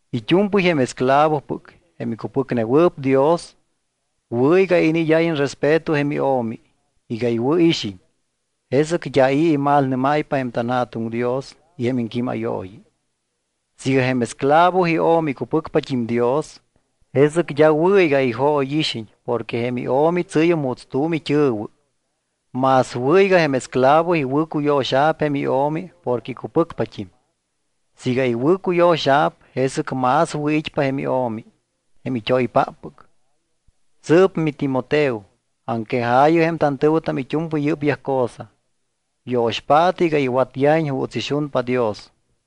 It́u̱mpɨy jém esclavopɨc, jém icupɨcnewɨɨp Dios, wɨ̱ iga iniid́áyiñ respeto jém io̱mi, iga iwɨ̱ixiñ. Jesɨc d́a i̱ imalnɨ́máypa jém tanJa̱tuŋ Dios y jém iŋquímayooyi. Siiga jém esclavo io̱mi icupɨcpat́im Dios, jesɨc d́a wɨ̱ iga ijóyixiñ porque jém io̱mi tsɨ́yum juuts tu̱m it́ɨ̱wɨ. Más wɨ̱ iga jém esclavo iwɨ̱cuyo̱xa̱p jém io̱mi porque icupɨcpat́im. Siiga iwɨ̱cuyo̱xa̱p, jesɨc más wɨ̱it́pa jém io̱mi, jém it́oypáppɨc. Sɨɨp, miTimoteo, aŋquejaayɨ jém tantɨ̱wɨtam it́u̱mpɨy yɨ́pyaj cosa, yo̱xpaatɨ iga iwatyajiñ juuts ixunpa Dios.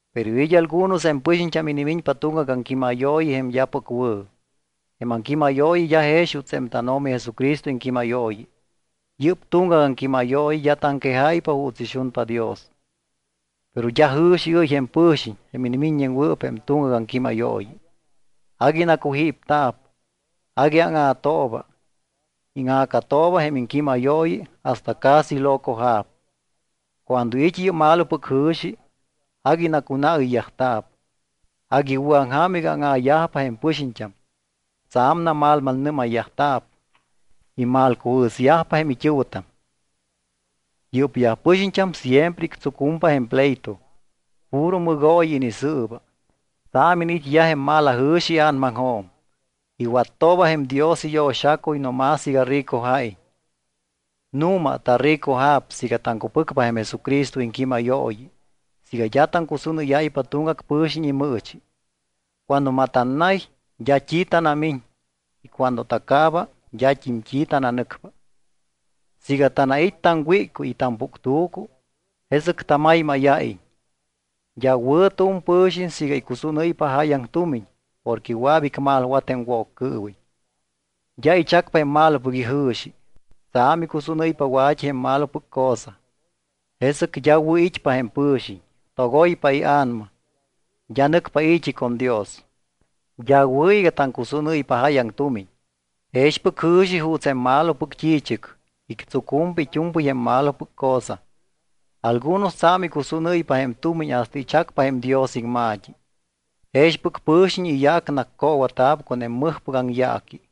Pero it́ algunos jém pɨxiñt́am inimiñpa tuŋgac aŋquímayooyi jém d́apɨc wɨ̱. Jém aŋquímayooyi d́a jex juuts jém tánO̱mi Jesucristo iŋquímayooyi. Yɨ́p tuŋgac aŋquímayooyi d́a taŋquejáypa juuts ixunpa Dios. Pero d́a jɨ̱xiɨ́y jém pɨ̱xiñ, jém inimiññewɨɨp jém tuŋgac aŋquímayooyi. Agui nacujípta̱p. Agui áŋa̱tooba. Íŋa̱catooba jém iŋquímayooyi hasta casi locoja̱p. Cuando it́ yɨ́p malopɨc jɨ̱xi, agui nacunaɨyyajta̱p. Agui iwɨ̱aŋja̱m iga áŋa̱yajpa jém pɨxiñt́am. Tsa̱m namalmalnɨ́mayyajta̱p. Imalcujɨ̱syajpa jém it́ɨ̱wɨtam. Yɨ́pyaj pɨxiñt́am siempre ictsucumpa jém pleito. Puro mɨgooyi inisɨɨba. Tsa̱m iniit́yaj jém malajɨ̱xi ia̱namaŋjo̱m. Iwattooba jém Dios iyo̱xacuy no más iga ricoja̱iñ. Nu̱ma taricoja̱p siiga taŋcupɨcpa jém Jesucristo iŋquímayooyi siiga d́a taŋcusúnɨ́yáypa tuŋgac pɨ̱xiñ imɨɨchi. Cuando matannay d́a t́i tanamiñ. Y cuando tacaaba d́at́im t́i tananɨcpa. Siiga tanait́ taŋwíccuy y tampuctu̱cu, jesɨc tamaymáya̱iñ. D́a wɨ̱ tu̱m pɨ̱xiñ siiga icusúnɨ́ypa jáyaŋ tumiñ porque wɨa̱p icmalwat jém Woccɨɨwiñ, d́a ichacpa jém malopɨc ijɨ̱xi. Tsa̱m icusúnɨ́ypa wa̱t́i jém malopɨc cosa. Jesɨc d́a wɨ̱ it́pa jém pɨ̱xiñ. Togoypa ia̱nama. D́a nɨcpa i̱t́i con Dios. D́a wɨ̱ iga taŋcusúnɨ́ypa jáyaŋ tumiñ. Jexpɨc jɨ̱xi juuts jém malopɨc t́i̱chɨc, ictsucumpa it́u̱mpɨy jém malopɨc cosa. Algunos tsa̱m icusúnɨ́ypa jém tumiñ hasta ichacpa jém Dios iŋma̱t́i. Jexpɨc pɨ̱xiñ iyaac naccoowa̱ta̱p con jém mɨjpɨc aŋyaaqui.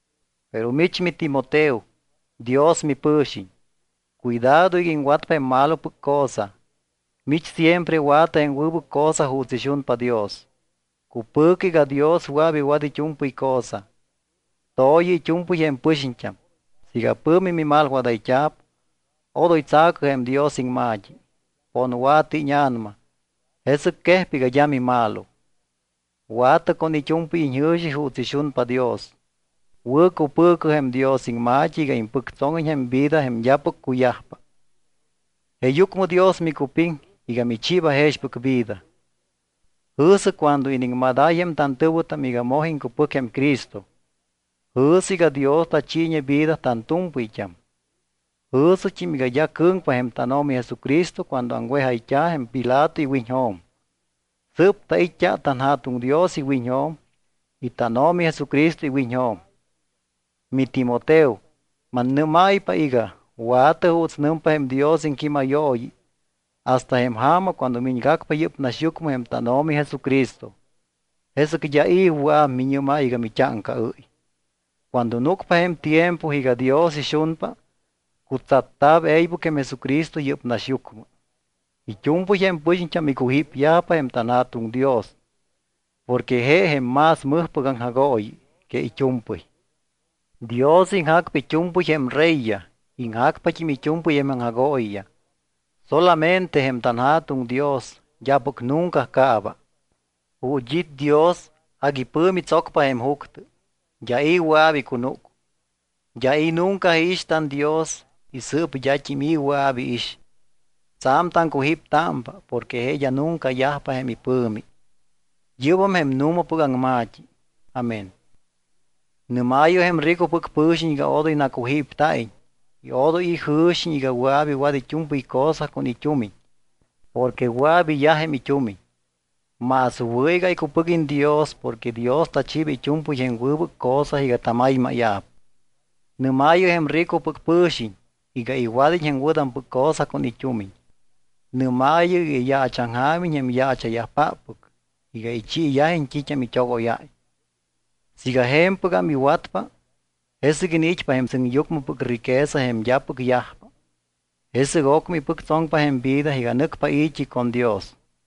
Pero mich miTimoteo, Dios mipɨ̱xiñ. Cuidado iga iŋwatpa jém malopɨc cosa. Mich siempre wa̱tɨ jém wɨbɨc cosa juuts ixunpa Dios. Cupɨ̱cɨ iga Dios wɨa̱p iwat it́u̱mpɨy cosa. To̱yɨ it́u̱mpɨy jém pɨxiñt́am. Siiga pɨ̱mi mimalwadayt́a̱p, odoy tsa̱cɨ jém Dios iŋma̱t́i. Ponwa̱tɨ íña̱nama, jesɨc quejpa iga d́a mimalo. Wa̱tɨ con it́u̱mpɨy iñjɨ̱xi juuts ixunpa Dios. Wɨ̱cupɨ̱cɨ jém Dios iŋma̱t́i iga impɨctsóŋiñ jém vida jém d́apɨc cuyajpa. Jeeyucmɨ Dios micupiŋ iga michiiba jexpɨc vida. Jɨ̱sɨ cuando iniŋmadáy jém tantɨ̱wɨtam iga moj iŋcupɨc jém Cristo. Jɨ̱sɨ iga Dios tachiiñe vida tantu̱mpɨyt́am. Jɨ̱sɨt́im iga d́a cɨ̱ŋpa jém tánO̱mi Jesucristo cuando aŋwejayt́a̱ jém Pilato iwiñjo̱m. Sɨɨp tait́t́a tanJa̱tuŋ Dios iwiñjo̱m y tánO̱mi Jesucristo iwiñjo̱m. MiTimoteo, mannɨ́máypa iga wa̱tɨ juuts nɨmpa jém Dios iŋquímayooyi hasta jém ja̱ma cuando miñgacpa yɨ́p naxyucmɨ jém tánO̱mi Jesucristo. Jesɨc d́a i̱ wɨa̱p miñɨ́máy iga mit́áŋcaɨ́y. Cuando núcpa jém tiempo iga Dios ixunpa, cutsatta̱p e̱ybɨc jém Jesucristo yɨ́p naxyucmɨ. It́u̱mpɨy jém pɨxiñt́am icujípyajpa jém tanJa̱tuŋ Dios porque je jém más mɨjpɨc aŋjagooyi que it́u̱mpɨy. Dios iŋjacpa it́u̱mpɨy jém reyyaj, iŋjacpat́im it́u̱mpɨy jém aŋjagooyiyaj. Solamente jém tanJa̱tuŋ Dios d́apɨc nunca caaba. Ju̱t́ it́ Dios, agui pɨ̱mi tsocpa jém juctɨ, d́a i̱ wɨa̱p icunúc. D́a i̱ nunca iix tanDios y sɨɨp d́at́im i̱ wɨa̱p iix. Tsa̱m taŋcujíptámpa porque je d́a nunca yajpa jém ipɨ̱mi. Yɨ́bam jém nu̱mapɨc aŋma̱t́i. Amén. Nɨ́maayɨ jém ricopɨc pɨ̱xiñ iga odoy nacujípta̱iñ y odoy ijɨ̱xiñ iga wɨa̱p iwat it́u̱mpɨy cosa con it́umiñ porque wɨa̱p iyaj jém it́umiñ. Más wɨ̱ iga icupɨguiñ Dios porque Dios tachiiba it́u̱mpɨy jém wɨbɨc cosa iga tamaymáya̱p. Nɨ́maayɨ jém ricopɨc pɨ̱xiñ iga iwad́iñ jém wɨ̱tampɨc cosa con it́umiñ. Nɨ́maayɨ iga iyaachaŋjaamiñ jém yaacha̱yajpáppɨc iga ichiiyajiñ t́it́am it́ogóyáy. Siiga je̱mpɨgam iwatyajpa, jesɨc iniit́pa jém sɨŋyucmɨpɨc riqueza jém d́apɨc yajpa. Jesɨc ocmɨ ipɨctsoŋpa jém vida iga nɨcpa i̱t́i con Dios.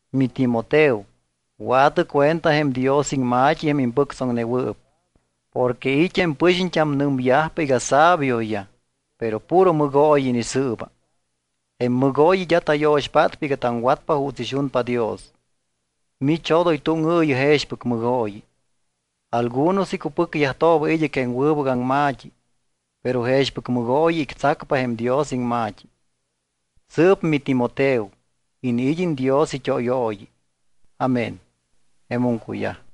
MiTimoteo, wa̱tɨ cuenta jém Dios iŋma̱t́i jém impɨctsoŋnewɨɨp porque it́ jém pɨxiñt́am nɨmyajpa iga sabioyaj, pero puro mɨgooyi inisɨɨba. Jém mɨgooyi d́a tayo̱xpátpa iga taŋwatpa juuts ixunpa Dios. Mich odoy túŋɨɨyɨ jexpɨc mɨgooyi. Algunos icupɨcyajtooba id́ɨc jém wɨbɨc aŋma̱t́i, pero jexpɨc mɨgooyi ictsacpa jém Dios iŋma̱t́i. Sɨɨp miTimoteo, iniid́iñ Dios it́óyooyi. Amén. Jemum cuyaj.